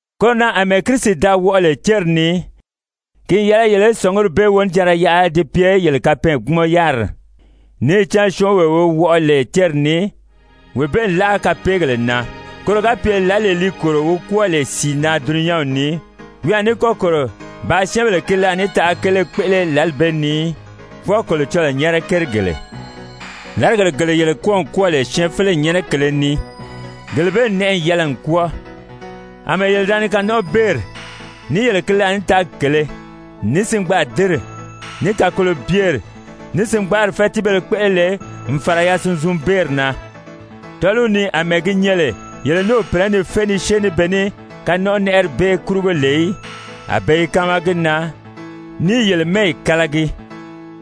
Koro na àmɛɛ Kirisi da wɔʔɔ lè céri ni, ki n yɛlɛ yele í sɔ̀nguri bee wonijanra yaʔa di pye yele kapɛɛnkpumɔn-yáriri. Níì cán syɔ́ɔnwee wi wɔʔɔ lè céri ni, wee bee n láʔa kapeegèle na, koro ga pye lǎlee li kòro wi kwɔ́ɔ lè sìi na dulunyanw ni, wi a ní kɔ́ kòro bàā syɛ́ɛnbèle ki laànitaʔa kele kpéʔele lǎli bee ni í, fwɔɔ Kolocɔlɔɔ nyɛ́nɛ kérigèle. Làrigèle gele yele kwɔ́ɔ n kwɔ́ɔ lè syɛɛnfeleyi nyɛ́nɛ kèlē ni, gele bee n nɛʔɛ n yɛlɛ n kwɔ́ɔ, àmɛɛ yele da ni kanɔnʔɔbeeri, ní yele ki laànitaagi kèlē, ní singbaadinri, ní kakolobyeri, ní singbaari fɛ́tiibéle kpéʔele lè n fàra yasunzunbeeri na. Tɔ́ɔliw ni àmɛɛ gi nyɛ lè yele ní o pìnɛ́ ni fé ni syée ní be ní kanɔnʔɔnɛʔɛri bee kurugo lè í, a be i káama gi na, ní i yele mɛ́ɛyi kálagi.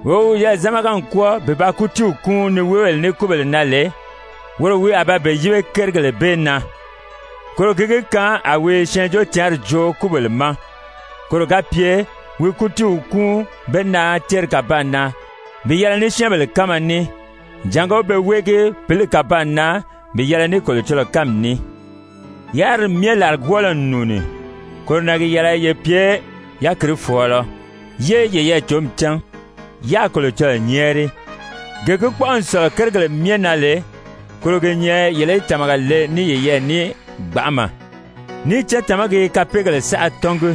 Wee wi wiyɛɛ zámaga n kwɔ́ɔ bi ba kútiiw kúun niweebèle ní kúbèle na lè, woro wi a ba be yíbe kérigèle bee na. Koro gi gi kaan a wi Syɛɛnjóocǎnri joo kúbèle ma, koro ga pye wi kútiiw kúun be na céri kàbaan na bi yɛlɛ ní syɛ́ɛnbèle kánma ní, jàngó pe wéege pǐli kàbaan na bi yɛlɛ ní Kolocɔlɔɔ kánmi ní. Yáriri myɛ làrigwɔɔlɔ n nùuni. Koro na gi yɛlɛ ye pye yákirifɔɔlɔ, yé yeyɛɛ cǒmi cán, yáā Kolocɔlɔɔ nyɛ́ɛri. Gee gi kpɔ́ʔɔ n sɔ̀lɔ kérigèle myɛ na lè, koro gi nyɛ yele í tàmaga le ní yeyɛɛ ní gbanʔama, níì cán tàmagi i kapeegèle saʔa tɔ́ngi.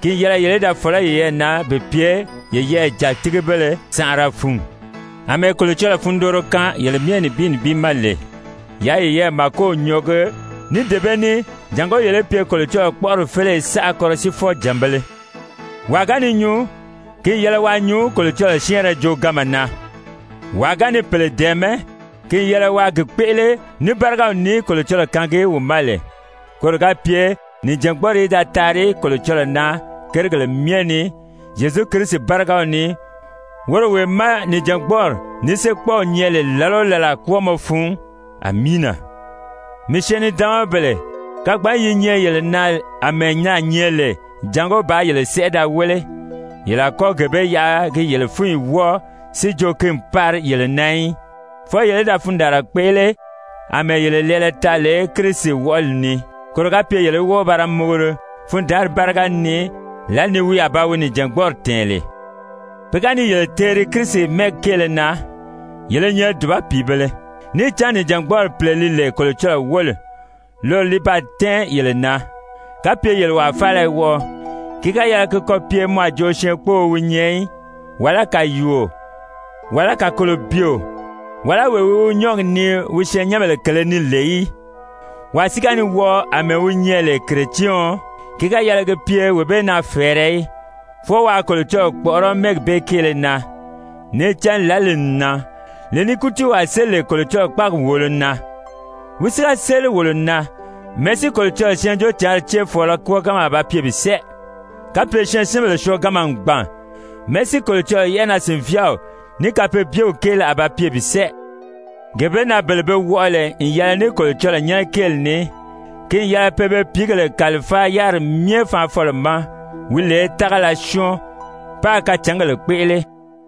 Ki n yɛlɛ yele í da fɔ̀lɔ́ yeyɛɛ na bi pye yeyɛɛ jàtigibéle sànʔara fun. Amɛɛ Kolocɔlɔɔ fundooro kaan yele myɛ nibin nibin ma lè, yaa yeyɛɛ màkow nyɔɔgi ní dee bee ní jàngó yele í pye Kolocɔlɔɔ kpɔ́ʔɔri féleye saʔa kɔrɔsiifɔ-jànbēle. Wàa ga ni nyuu, ki n yɛlɛ waa nyuu Kolocɔlɔɔ syɛ́ɛnrɛ jooganma na. Wàa ga ni pèle dɛ̀ɛmɛ́, ki n yɛlɛ waa gi kpéʔele ní bárigaw ní Kolocɔlɔɔ kaangi wi ma lè, koro ga pye nìjangbɔɔri í da taari Kolocɔlɔɔ na kérigèle myɛ ni, Zyezu Kirisi bárigaw ni, woro wee má nìjangbɔɔri, ní séekpɔɔw nyɛ lè làla o làla kwɔ́ɔmɔ fun. Amiina! Mii syɛɛn-nidaanmabèle, kagbanyi yi nyɛ yele na àmɛɛ naà nyɛ lè jàngó bàā yele sɛʔɛ da wéle, yele a kɔ́ gee bee yaʔa gi yele fúnyi wɔ́ɔ si jo ki n pari yele na í. Fwɔɔ yele í da fundaanra kpéʔele àmɛɛ yele lɛɛlɛ taa lè Kirisi wɔʔɔli ni, koro ga pye yele í wɔ́ɔ ba ra muguri fundaanri báriga ni lǎli ni wi a ba wi nìjangbɔɔri tɛ̀ɛn lè. Pe ga ni yele teeri Kirisi mɛ́ɛgi kéele na, yele i nyɛ dùba pìibēle, níì cán nìjangbɔɔri Pìle li lè Kolocɔlɔɔ wóli, loro li baa tɛ́ɛn yele na! Kapye yele wàa faala i wɔʔɔ, ki ga yɛlɛ ki kɔ pye mɔ a jo syɛɛnkpóō wi nyɛ í, wàlá kàyuuo, wàlá kakolobyeo, wàlá wee wi wi nyɔ́ɔgi nii wi syɛɛnnyɛnbèle kèlē ni lè í. Wàa si ga ni wɔʔɔ àmɛɛ wi nyɛ lè Kiretyɛɔn, ki ga yɛlɛ gi pye wee bee na fɛ̀ɛrɛ í. Fwɔɔ waa Kolocɔlɔɔ kpɔ̀ʔɔrɔ́ mɛ́ɛgi bee kéele na. Níì cán lǎli n nan, lee ni kútiiw a séli lè Kolocɔlɔɔ kpáagi wòolo na. Wi si ga séli wolo na, mɛ̀ɛ́ si Kolocɔlɔɔ Syɛɛnjóocǎnri céefɔɔlɔ kwɔ́ɔganma a ba pye bi sɛ́ɛ? Kapye syɛɛnsinbèle syɔɔganma n gbàn, mɛ̀ɛ́ si Kolocɔlɔɔ yɛ́ʔɛnaa-sìnvyaaw ní kapeebyew kéele a ba pye bi sɛ́ɛ? Gee bee na bele be wɔʔɔ lè n yɛlɛ ní Kolocɔlɔɔ nyɛ́nɛ kéeli ní, ki n yɛlɛ pe be pìígèle kàlifáa yáriri myɛ Faanfɔlɔ ma, wi lè tágala syɔ́ɔn, páā kacǎngèle kpéʔele.